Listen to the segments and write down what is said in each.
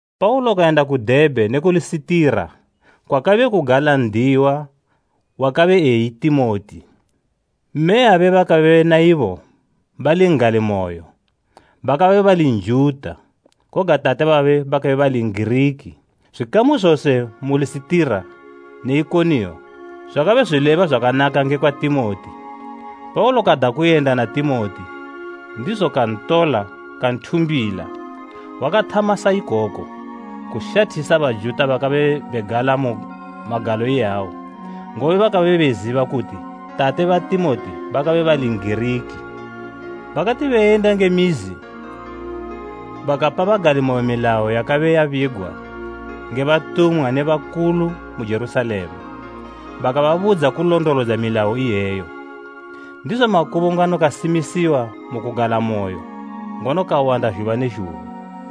Paulo kayenda ku Debhe ne ku Lisitira, kwakabe kugala n'diyiwa wakabe eyi Timoti. Mme yabe bakabe na ibo bali n'galimoyo, bakabe bali Njuta, koga tate babe bakabe bali N'giriki. Zwikamu zose mu Lisitira ne Ikoniyo zwakabe zwileba zwakanaka ngekwa Timoti. Paulo kada kuyenda na Timoti, ndizo kantola kanthumbila. Wakathama sa ikoko, kushathisa Bajuta bakabe begala mu magalo iyawo, ngobe bakabe beziba kuti tate ba Timoti bakabe bali N'giriki. Bakati beyenda nge mizi, bakapa bagalimoyo milayo yakabe yabigwa nge batumwa ne bakulu mu Jerusalema, bakababudza kulondolodza milayo iyeyo. Ndizo makubungano kasimisiwa mu kugalamoyo ngono kawanda zhuba ne zhuba.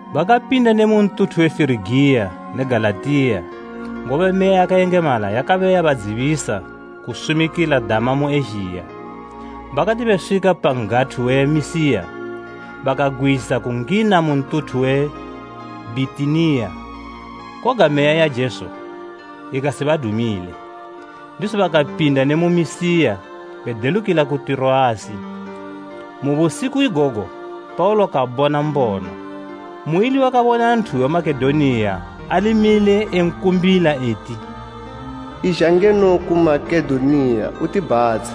Bakapinda ne mu ntuthu we Firigiya ne Galatiya, ngobe Meya yakayengemala yakabe yabadzibisa kusumikila dama mu Ezhiya. Bakati beswika pa n'gathu we Misiya, bakagwisa kungina mu ntuthu we Bhitiniya, koga Meya ya Jesu ikasibadumile. Ndizo bakapinda ne mu Misiya bedelukila ku Tiroasi. Mu busiku igogo Paulo kabona mbono, muili wakabona nthu we Makedoniya ali mile enkumbila eti, “Izha ngeno ku Makedoniya utibhatshe!”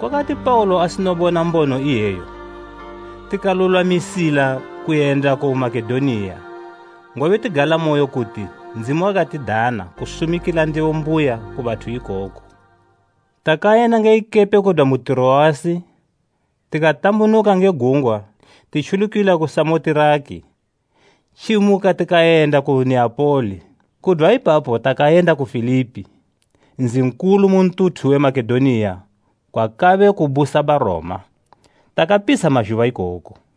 Kwakati Paulo asino bona mbono iyeyo tikalulwamisila kuyenda ku Makedoniya, ngobe tigalamoyo kuti Ndzimu wakatidana kusumikila ndebo mbuya ku bathu ikoko. Takayenda nge ikepe kudwa mu Tiroasi tikatambunuka nge gungwa titjulukila ku Samotiraki, tjimuka tikayenda ku Neapoli. Kudwa ipapo takayenda ku Filipi, nzi nkulu mu ntuthu we Makedoniya kwakabe kubusa Baroma. Takapitsha mazhuba ikoko.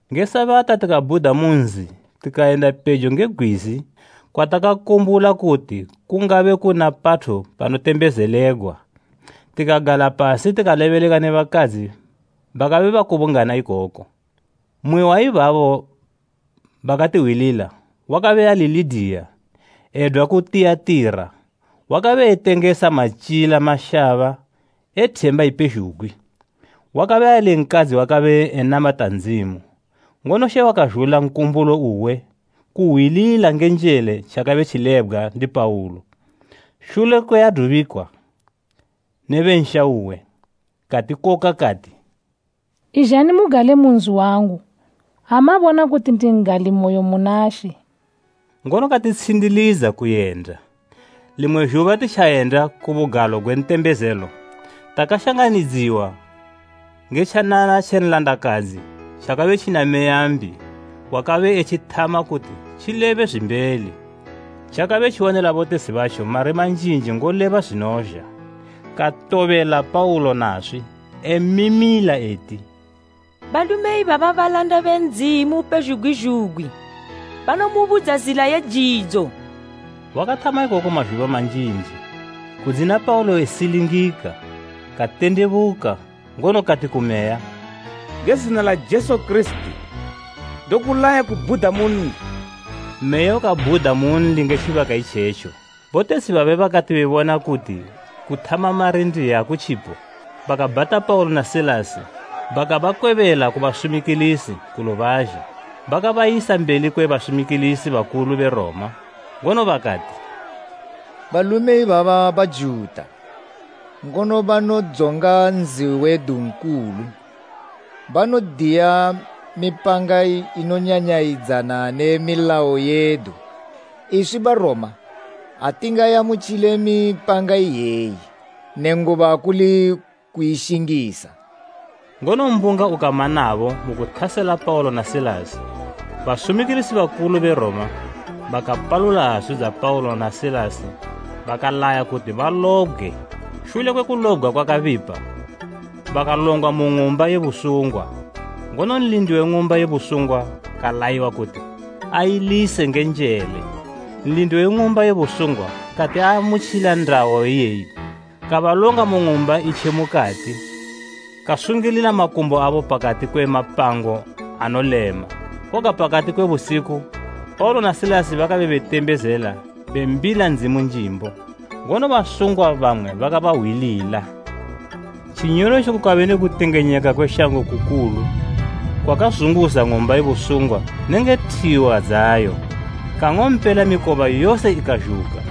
Nge Sabata tikabhuda mu nzi tikayenda pejo nge gwizi kwatakakumbula kuti kungabe kuna pathu panotembezelegwa. Tikagala pasi tikalebeleka ne bakadzi bakabe bakubungana ikoko. Mmwe wa ibabo wakatihwilila wakabe ali Lidiya edwa ku Tiyatira, wakabe etengesa matyila mashaba e themba ipezhugwi. Wakabe ali nkadzi wakabe enamata Ndzimu, ngono She wakazhula nkumbulo uwe kuhwilila nge njele tjakabe tjilebgwa ndi Paulo. Shule kwe adubikwa ne be nsha uwe, katikoka kati, “Izhani mugale mu nzi wangu ha mabona kuti ndi n'galimoyo muna She.” Ngono katitshindilidza kuyenda. Limwe zhuba titjayenda ku bugalo gwe ntembezelo, takashanganidziwa nge tjanana tje nlandakadzi tjakabe tjina meya mbi wakabe utjithama kuti tjilebe zwimbeli. Tjakabe tjiwanila botetshi batjo mari manjinji ngoleba zwinozha. Katobelela Paulo naswi, emimila eti, “Balume ibaba balanda be Ndzimu upezhugwi zhugwi! Banomubudza zila ye jidzo!” Wakathama ikoku mazhuba manjinji, kudzina Paulo esilingika, katendebuka, ngono kati ku meya, “Nge zina la Jesu Kirisiti, ndokulaya kubhuda munli!” Meya ukabhuda munli nge tjibaka itjetjo. Botetshi babe bakati bebona kuti kuthama mari ndiye akutjipo, bakabhata Paulo na Silasi bakabakwebela ku basumikilisi ku lubazhe. Bakabayisa mbeli kwe basumikilisi bakulu be Roma, ngono bakati, “Balume ibaba Bajuta, ngono banodzonga nzi wedu nkulu. Banodiya mipanga inonyanyayidzana ne milayo yedu; iswi Baroma, atingaamutjile mipanga iyeyi nenguba kuli kuishingisa.” Ngono mbunga ukama nabo mu kuthasela Paulo na Silasi. Basumikilisi bakulu be Roma bakapalula hazu dza Paulo na Silasi bakalaya kuti balobgwe. Shule kwe kulobgwa kwakabipa, bakalongwa mu ng'umba ye busungwa, ngono nlindi we ng'umba ye busungwa kalayiwa kuti ailise nge njele. Nlindi we ng'umba ye busungwa kati aamutjila ndayo iyeyi, kabalonga mu ng'umba i tje mukati kasungilila makumbo abo pakati kwe mapango anolema. Koga pakati kwe busiku Paulo na Silasi bakabe betembezela bembila Ndzimu njimbo, ngono basungwa bamwe bakabahwilila. Tjinyolotjo kukabe ne kutengenyeka kwe shango kukulu, kwakazunguza ng'umba ye busungwa nenge thiwa dzayo. Kang'ompela mikoba yose ikazhuka,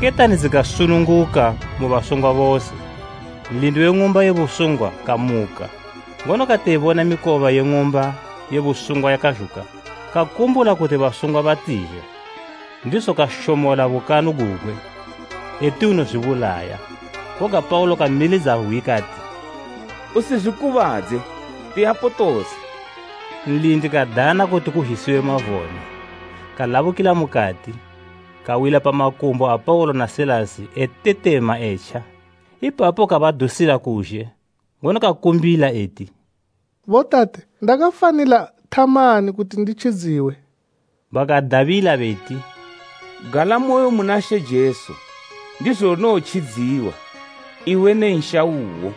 ketani dzikasununguka mu basungwa bose. Nlindi we ng'umba ye busungwa kamuka, ngono kati ebona mikoba ye ng'umba ye busungwa yakazhuka, kakumbula kuti basungwa batizha, ndizo kashomola bukanu gugwe, eti unozwibulaya. Koga Paulo kamilidza hwi kati, “Usizwikubadze! Tiyapo tose!” Nlindi kadana kuti kuzhisiwe mavone, kalabukila mukati, kawila pa makumbo a Paulo na Silasi etetema etja. Ipapo kabadusila kuzhe, ngono kakumbila eti, “Botate, ndakafanila thamani kuti nditjidziwe?” Bakadabila beti, “Galamoyo muna She Jesu, ndizo unowotjidziwa, iwe ne nsha uwo.”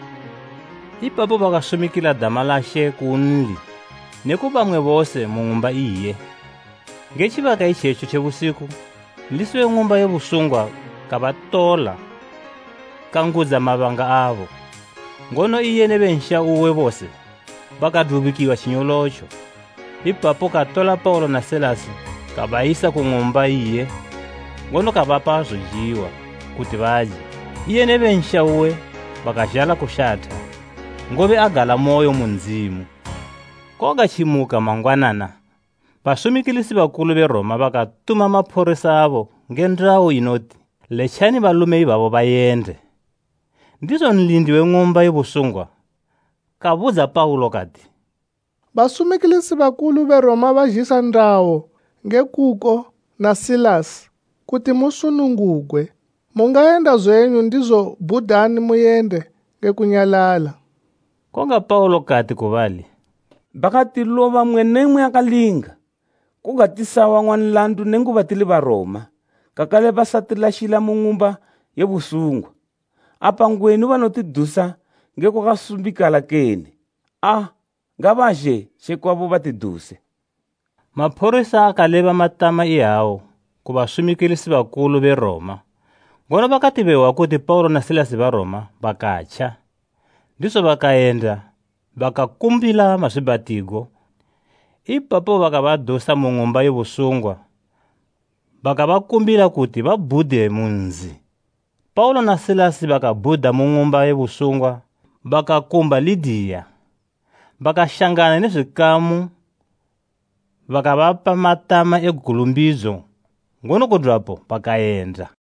Ipapo bakasumikila dama la She kunli ne ku bamwe bose mu ng'umba iye. Nge tjibaka itjetjo tje busiku nlisi we ng'umba ye busungwa kabatola kangudza mabanga abo; ngono iye ne be nsha uwe bose bakadubikwa tjinyolotjo. Ipapo katola Paulo na Silasi kabayisa ku ng'umba iye ngono kabapa zojiwa kuti baje. Iye ne be nsha uwe bakazhala kushatha, ngobe agalamoyo mu Ndzimu. Koga tjimuka mangwanana basumikilisi bakulu be Roma bakatuma maphorisa abo nge ndayo inoti, “Letjani balume ibabo bayende.” Ndizo Nlindi we ng'umba ye busungwa kabudza Paulo kati, “Basumikilisi bakulu be Roma bazhisa ndayo nge kuko na Silasi kuti musunungugwe. Mungayenda zwenyu ndizo bhudani muyende, nge kunyalala.” Koga Paulo kati ku bali, “Bakatiloba mmwe ne mmwe akalinga koga tisawang'wa nlandu nenguba tili Baroma kakale bakatilashila mu ng'umba ye busungwa. Apa ngwenu banotidusa nge kwakasumbikala kene? Aa, ngabazhe tje kwabo batiduse.” Maphorisa akaleba matama iyawa ku basumikilisi bakulu be Roma; ngono bakati behwa kuti Paulo na Silasi Baroma, bakatja. Ndizo bakayenda bakabakumbila mazwiibhatigo; ipapo bakabadusa mu ng'umba ye busungwa bakabakumbila kuti babhude mu nzi. Paulo na Silasi bakabhuda mu ng'umba ye busungwa bakakumba Lidiya. Bakashangana ne zwikamu bakabapa matama e gulumbidzo ngono kudwapo bakayenda.